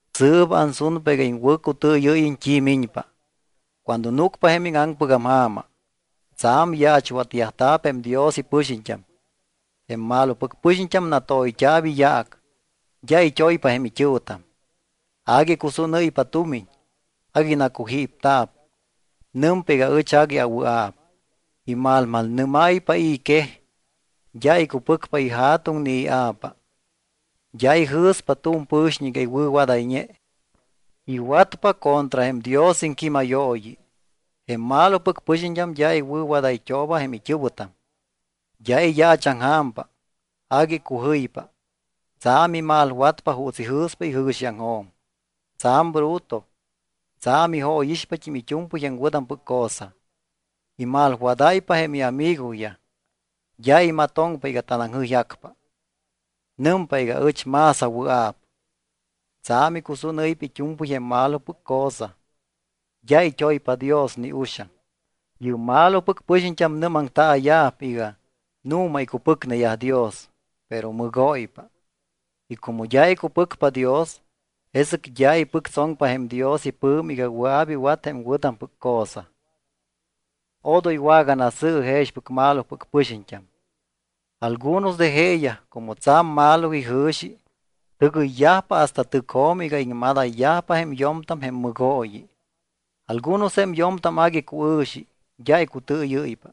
Sɨɨp ansunpa iga iŋwɨ̱cutɨɨyɨ́yiñ t́i miñpa. Cuando núcpa jém íŋaŋpɨgam ja̱ma, tsa̱m yaachwatyajta̱p jém Dios ipɨxiñt́am. Jém malopɨc pɨxiñt́am natoyt́a̱p iyaac, d́a it́oypa jém it́ɨ̱wɨtam, agui icusúnɨ́ypa tumiñ, agui nacujípta̱p, nɨmpa iga ɨch agui awɨa̱p, imalmalnɨ́máypa i̱ quej, d́a icupɨcpa ija̱tuŋ ni ia̱pa, d́a ijɨ̱spa tu̱m pɨ̱xiñ iga iwɨ̱wadayñe, iwatpa contra jém Dios iŋquímayooyi. Jém malopɨc pɨxiñt́am d́a iwɨ̱wadayt́ooba jém it́ɨ̱wɨtam, d́a iyaachaŋja̱mpa, agui icujɨypa. Tsa̱m imalwatpa juuts ijɨ̱spa ijɨ̱xiaŋjo̱m. Tsa̱m bruto. Tsa̱m ijóyixpat́im it́u̱mpɨy jém wɨ̱tampɨc cosa. Imalwadáypa jém iamigoyaj. D́a imatoŋpa iga tanaŋjɨyjacpa. Nɨmpa iga ɨch más awɨa̱p. Tsa̱m icusúnɨ́ypa it́u̱mpɨy jém malopɨc cosa. D́a it́oypa Dios ni uxaŋ. Yɨ́p malopɨc pɨxiñt́am nɨ́maŋtaaya̱p iga nu̱ma icupɨcneyaj Dios, pero mɨgóypa. Y como d́a icupɨcpa Dios, jesɨc d́a ipɨctsoŋpa jém Dios ipɨ̱mi iga wɨa̱p iwat jém wɨ̱tampɨc cosa. Odoy waganasɨ̱ɨ jexpɨc malopɨc pɨxiñt́am. Algunos de jeeyaj, como tsa̱m malo ijɨ̱xi, tɨgɨyyajpa hasta tɨcjo̱m iga iŋmadayyajpa jém yo̱mtam jém mɨgooyi. Algunos jém yo̱mtam agui cuɨ̱xi, d́a icutɨɨyɨ́ypa,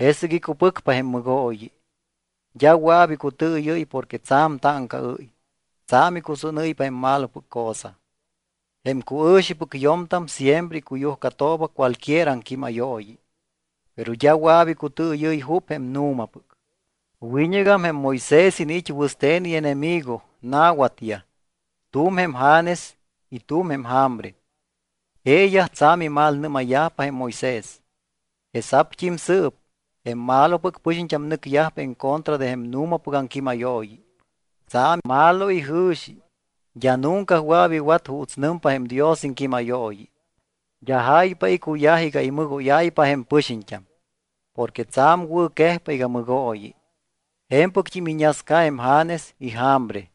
jesɨc icupɨcpa jém mɨgooyi. D́a wɨa̱p icutɨɨyɨ́y porque tsa̱m táŋcaɨ́y, tsa̱m icusúnɨ́ypa jém malopɨc cosa. Jém cuɨ̱xipɨc yo̱mtam siempre icuyujcatooba cualquier aŋquímayooyi. Pero d́a wɨa̱p icutɨɨyɨ́y jup jém nu̱mapɨc. Wiñɨgam jém Moisés iniit́ wɨste̱n ienemigo, na̱watyaj. Tu̱m jém Janes y tu̱m jém Jambre. Jeeyaj tsa̱m imalnɨ́mayyajpa jém Moisés. Jesa̱pt́im sɨɨp, jém malopɨc pɨxiñt́am nɨcyajpa encontra de jém nu̱mapɨc aŋquímayooyi. Tsa̱m malo ijɨ̱xi, d́a nunca wɨa̱p iwat juuts nɨmpa jém Dios iŋquímayooyi. D́a jáypa icuyaj iga imɨgóyayyajpa jém pɨxiñt́am, porque tsa̱m wɨ̱quejpa iga mɨgooyi. Je̱mpɨct́im iñasca jém Janes y Jambre.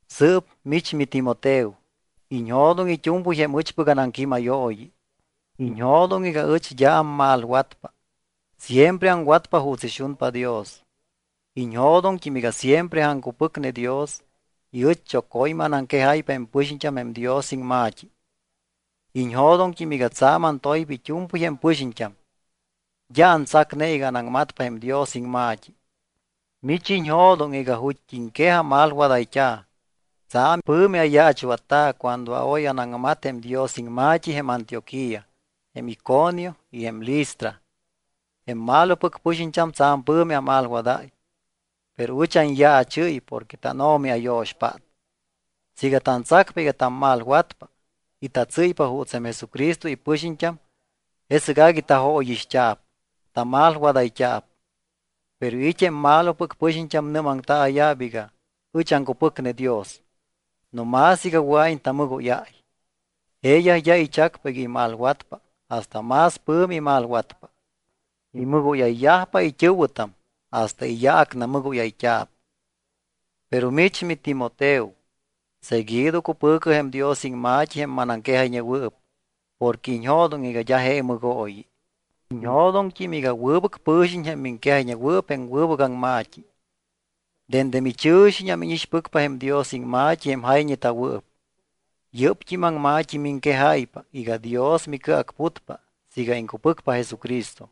Sɨɨp mich miTimoteo, iñjo̱doŋ it́u̱mpɨy jém ɨchpɨc anaŋquímayooyi. Iñjo̱doŋ iga ɨch d́a ammalwatpa, siempre aŋwatpa juuts ixunpa Dios. Iñjo̱doŋt́im iga siempre aŋcupɨcne Dios y ɨch choco̱ymɨ anaŋquejáypa jém pɨxiñt́am jém Dios iŋma̱t́i. Iñjo̱doŋt́im iga tsa̱m antoypa it́u̱mpɨy jém pɨxiñt́am, d́a antsacne iga anaŋmatpa jém Dios iŋma̱t́i. Mich iñjo̱doŋ iga ju̱t́iŋquej amalwadayt́a̱. Tsa̱m pɨ̱mi ayaachwatta̱ cuando oy anaŋmat jém Dios iŋma̱t́i jém Antioquía, jém Iconio y jém Listra. Jém malopɨc pɨxiñt́am tsa̱m pɨ̱mi amalwadáy, pero ɨch anyaachɨ́y porque tánO̱mi ayo̱xpát. Siiga tantsacpa iga tammalwatpa y tatsɨ́ypa juuts jém Jesucristo ipɨxiñt́am, jesɨc agui tajóyixt́a̱p, tamalwadayt́a̱p. Pero it́ jém malopɨc pɨxiñt́am nɨ́maŋtaaya̱p iga ɨch aŋcupɨcne Dios no más iga wɨa̱iñ tamɨgóyáy. Jeeyaj d́a ichacpa iga imalwatpa hasta más pɨ̱mi imalwatpa. Imɨgóyayyajpa it́ɨ̱wɨtam hasta iyaac namɨgóyayt́a̱p. Pero mich miTimoteo, seguido cupɨ̱cɨ jém Dios iŋma̱t́i jém manaŋquejayñewɨɨp porque iñjo̱doŋ iga d́a je mɨgooyi. Iñjo̱doŋt́im iga wɨbɨc pɨ̱xiñ jém miŋquejayñewɨɨp jém wɨbɨc aŋma̱t́i. Dende michɨ̱xiñam íñixpɨcpa jém Dios iŋma̱t́i jém jayñeta̱wɨɨp. Yɨ́pt́im aŋma̱t́i miŋquejáypa iga Dios micɨacputpa siiga iŋcupɨcpa Jesucristo.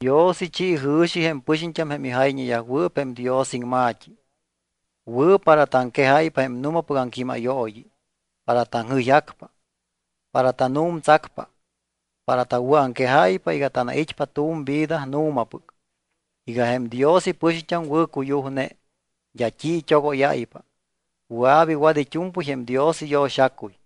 Dios ichi jɨ̱xi jém pɨxiñt́am jém ijayñeyajwɨɨp jém Dios iŋma̱t́i. Wɨ̱ para taŋquejáypa jém nu̱mapɨc aŋquímayooyi, para taŋjɨyjacpa, para tanu̱mtsacpa, para tawɨ̱aŋquejáypa iga tanait́pa tu̱m vida nu̱mapɨc, iga jém Dios ipɨxiñt́am wɨ̱cuyujne, d́a t́i it́ogóyáypa, wɨa̱p iwat it́u̱mpɨy jém Dios iyo̱xacuy.